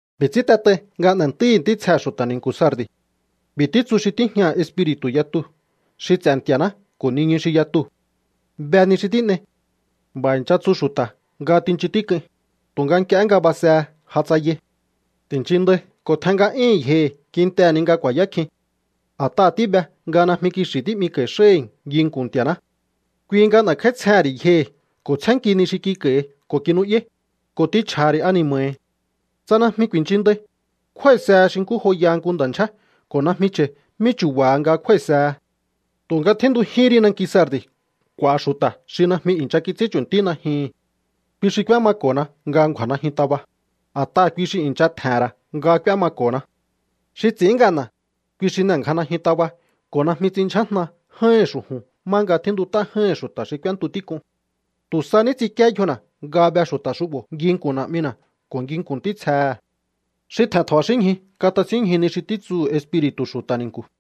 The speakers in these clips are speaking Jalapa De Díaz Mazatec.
’B'i̱ ts'ín t'et'ai nga n'e̱ntúíhi̱ ntítsjehe̱ xu̱ta̱ ni̱nku̱ Sardi̱: “B'i̱ títsu xi tíjñaha̱ espiri̱tu̱ yatu xi ts'e̱ Nti̱a̱ná ko̱ niñu xi yatuu̱: Be ni xi tín'ei. B'a̱ i̱ncha tsu xu̱ta̱ nga tinchun tík'uin, tu̱nga nk'ie nga basehe ja tsayai. Ti̱nchin ndai ko̱ tjen nga'yíhi̱n yjohi̱ kintehe̱ ni nga ku̱a̱yá kjin. A̱t'aha̱ tíbe nga najmi kixi̱ tí'miko̱i̱ xáhi̱ nginku̱n Nti̱a̱ná. ’Kui nga n'e̱kj'áítsjehe̱n ri̱ yjohi̱ ko̱ tsjénnki ni xi kik'a̱i̱hi ko̱ kinu'yáí, ko̱ t'inchj'a̱ha̱ ri̱ ani̱ma̱hi̱. Tsa najmi ku̱i̱nchinndai, kjúái̱sehe xi nkú joyaha nku nda̱ ndyjé ko̱ najmi cha̱i mí chu̱ba̱ha nga kjúái̱sehe. Tu̱nga tjíntujíhín ri nanki Sardi̱ k'u̱a̱ xu̱ta̱ xi najmi i̱ncha kits'ín chu̱ntí najyuhu̱n. Kui xi k'úémako̱na nga ngju̱a̱ najyun taba, a̱t'aha̱ kui xi i̱ncha tje̱he̱n ra̱ nga k'úémako̱na. ’Xi ts'i̱ín ngana̱, kui xi n'e̱ngja najyun taba ko̱ najmi ts'in ndyjájna j'áíhi̱n xu̱ju̱n má nga tjíntut'á j'áíhi̱n xu̱ta̱ xi k'úéntu tík'un. Tu̱ sa ní ts'inkíé yjona̱ nga be xu̱ta̱ xu'bo̱ nginku̱n Na̱'mina̱ ko̱ nginku̱n ntítsjehe̱. ’¡Xi tje̱n tja̱ba̱xínñju katasínñju ni xi títsuhu̱ Espiri̱tu̱ xu̱ta̱ ni̱nku̱!”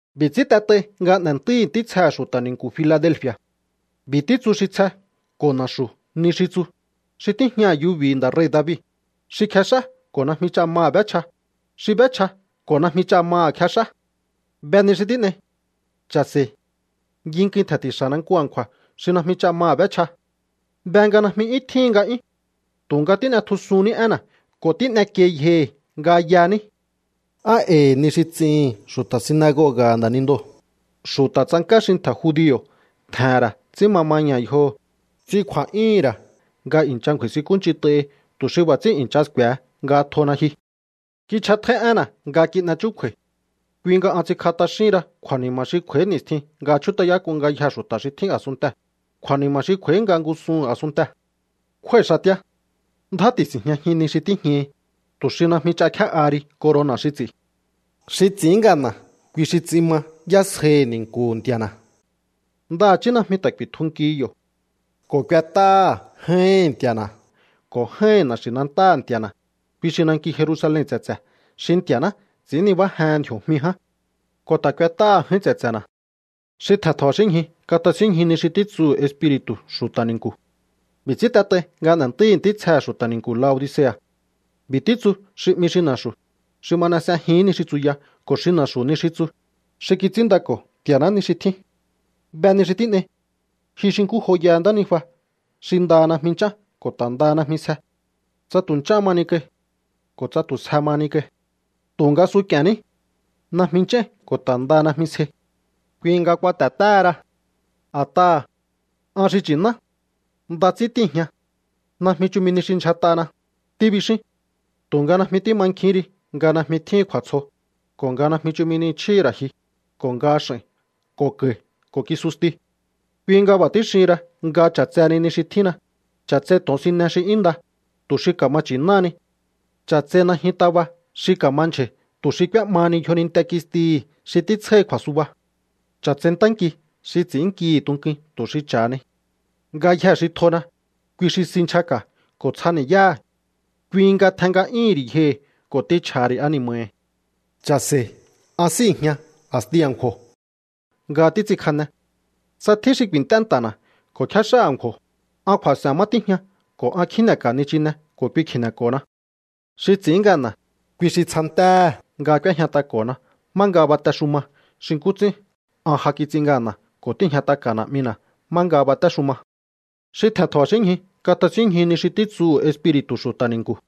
’B'i̱ ts'ín t'et'ai nga n'e̱ntúíhi̱ ntítsjehe̱ xu̱ta̱ ni̱nku̱ Filadelfi̱a̱: “B'i̱ títsu xi tsje ko̱ na̱xu̱ ni xi tsu, xi tíjñaha̱ yubi̱hi̱ nda̱ rei̱ David, xi kjex'á ko̱ najmi ch'a maha̱ b'échja, xi b'échja ko̱ najmi ch'a maha̱ kjex'á: Be ni xi tín'ei. Cha̱se̱i̱. Nginkuin tje̱nti̱xa̱na nku a̱nkju̱a̱ xi najmi ch'a maha̱ b'échja. Be nga najmi 'yún tjíhin nga'yún, tu̱nga tín'etjusunní énna̱ ko̱ tín'ekiei yjohi̱ nga yaní. Nd'a̱i̱ ni xi ts'ihi̱n xu̱ta̱ sinagoga̱ha̱ nda̱nindoo̱, xu̱ta̱ tsank'á xi ntje̱ judio̱ tje̱he̱n ra̱ ts'ín ma maña̱ yjoho̱, ts'in kju̱a̱'yúhu̱n ra̱ nga i̱ncha ngju̱a̱i̱sinkúnch'int'ahi tu̱ xi b'a̱ ts'ín i̱ncha sku̱e̱he nga tjona ji. ’Kich'atjóí énna̱ nga kin'e chúkju̱a̱i̱. Kui nga an ts'inkj'a t'axíhin ra kju̱a̱ni̱ma̱ xi kj'u̱a̱í ni̱stjin nga chjút'ayák'un ngayjee̱ xu̱ta̱ xi tjín a̱sunntee̱, kju̱a̱ni̱ma̱ xi kj'u̱a̱í nga ngúsuhu̱n a̱sunntee̱. Kjúái̱ xatíá. Ndjá ti̱si̱njñajin ni xi tíjñahi, tu̱ xi najmi ch'a kjé'aha ri corona̱ xi ts'i̱. ’Xi ts'i̱ín ngana̱, kui xi ts'in ma yásjaihi̱ ni̱nku̱hu̱ Nti̱a̱na̱. Ndaha̱chí najmi ta̱ ku̱i̱tjunkihi yo̱. Ko̱ k'uet'áha̱ j'áíhi̱n Nti̱a̱na̱ ko̱ j'áíhi̱n na̱xi̱nantáha̱ Nti̱a̱na̱, kui xi nanki Jerusalen tse̱tse̱ xi Nti̱a̱ná ts'i̱ín nibájehen ndji̱o̱jmi ján. Ko̱ ta̱ k'uet'áha̱ j'áín tse̱tse̱na̱. ’¡Xi tje̱n tja̱ba̱xínñju katasínñju ni xi títsuhu̱ Espiri̱tu̱ xu̱ta̱ ni̱nku̱!” ’B'i̱ ts'ín t'et'ai nga n'e̱ntúíhi̱ ntítsjehe̱ xu̱ta̱ ni̱nku̱ Laodicea̱: “B'i̱ títsu xi 'mi Xi Na̱xu̱, xi ma n'e s'ejihi̱ín ni xi tsuya ko̱ xi na̱xu̱ ni xi tsu, xi kits'ínndako̱ Nti̱a̱ná ni xi tjín: Be ni xi tín'ei. Ji xi nkú joyaha ntánijua xi ndaha najmi nch'án ko̱ ta̱ ndaha najmi sje. ¡Tsa tu̱ nch'áhan mahani kai, ko̱ tsa tu̱ sje mahani kai! Tu̱nga suk'i̱e̱nní. Najmi nch'áín ko̱ ta̱ ndaha najmi sjei. Kui nga kuate̱téhera. A̱t'aha̱: An xi nchi̱ná. Nda ts'ín tíi̱jña. Najmi chumi nihi xi ndyjat'ana, tíbixín. Tu̱nga najmi tímankjihín ri nga najmi tjíhin kju̱a̱tsjo, ko̱ nga najmi chumi ni chjíhi̱ ra̱ ji, ko̱ nga x'a̱i̱n ko̱ ka̱i̱ ko̱ kisusti. ’Kui nga b'a̱ tíxihin ra nga ch'a̱tseheni ni xi tjínna. Ch'a̱tsei to̱onsine xi 'yún nda, tu̱ xi ka̱ma nchi̱náhani. Ch'a̱tsei najyun taba xi ka̱mandyja̱i̱ tu̱ xi k'úé'mahani yjoninte kistihi̱ xi títsjáhi kju̱a̱suba. Ch'a̱tsei ntánki xi ts'i̱ínnkihi̱ tunkuin tu̱ xi cha̱hani. ’Ngayjee̱ xi tjona, kui xi si nchjaka̱ ko̱ tsjani̱yáha̱. Kui nga tjen nga'yúhu̱n ri̱ yjohi̱ ko̱ t'inchj'a̱ha̱ ri̱ ani̱ma̱hi̱. Cha̱se̱i̱. An síi̱jña a̱sti a̱nkju̱o̱ nga títs'inkjane. Tsa tjín xi ku̱i̱nt'é nta̱na̱ ko̱ kjéx'á a̱nkju̱o̱, an kju̱a̱s'e̱n má tíjña ko̱ an kjíne̱ka̱ nichine ko̱ kui kji̱ne̱ko̱na. ’Xi ts'i̱ín ngana̱, kui xi tsjantéhe̱ nga k'úéjñat'ako̱na má nga batexuma xi nkú ts'ín an ja kits'in ngana̱ ko̱ tíi̱jñat'aka̱ Na̱'mina̱ má nga batéxuma. ’¡Xi tje̱n tja̱ba̱xínñju katasínñju ni xi títsuhu̱ Espiri̱tu̱ xu̱ta̱ ni̱nku̱!”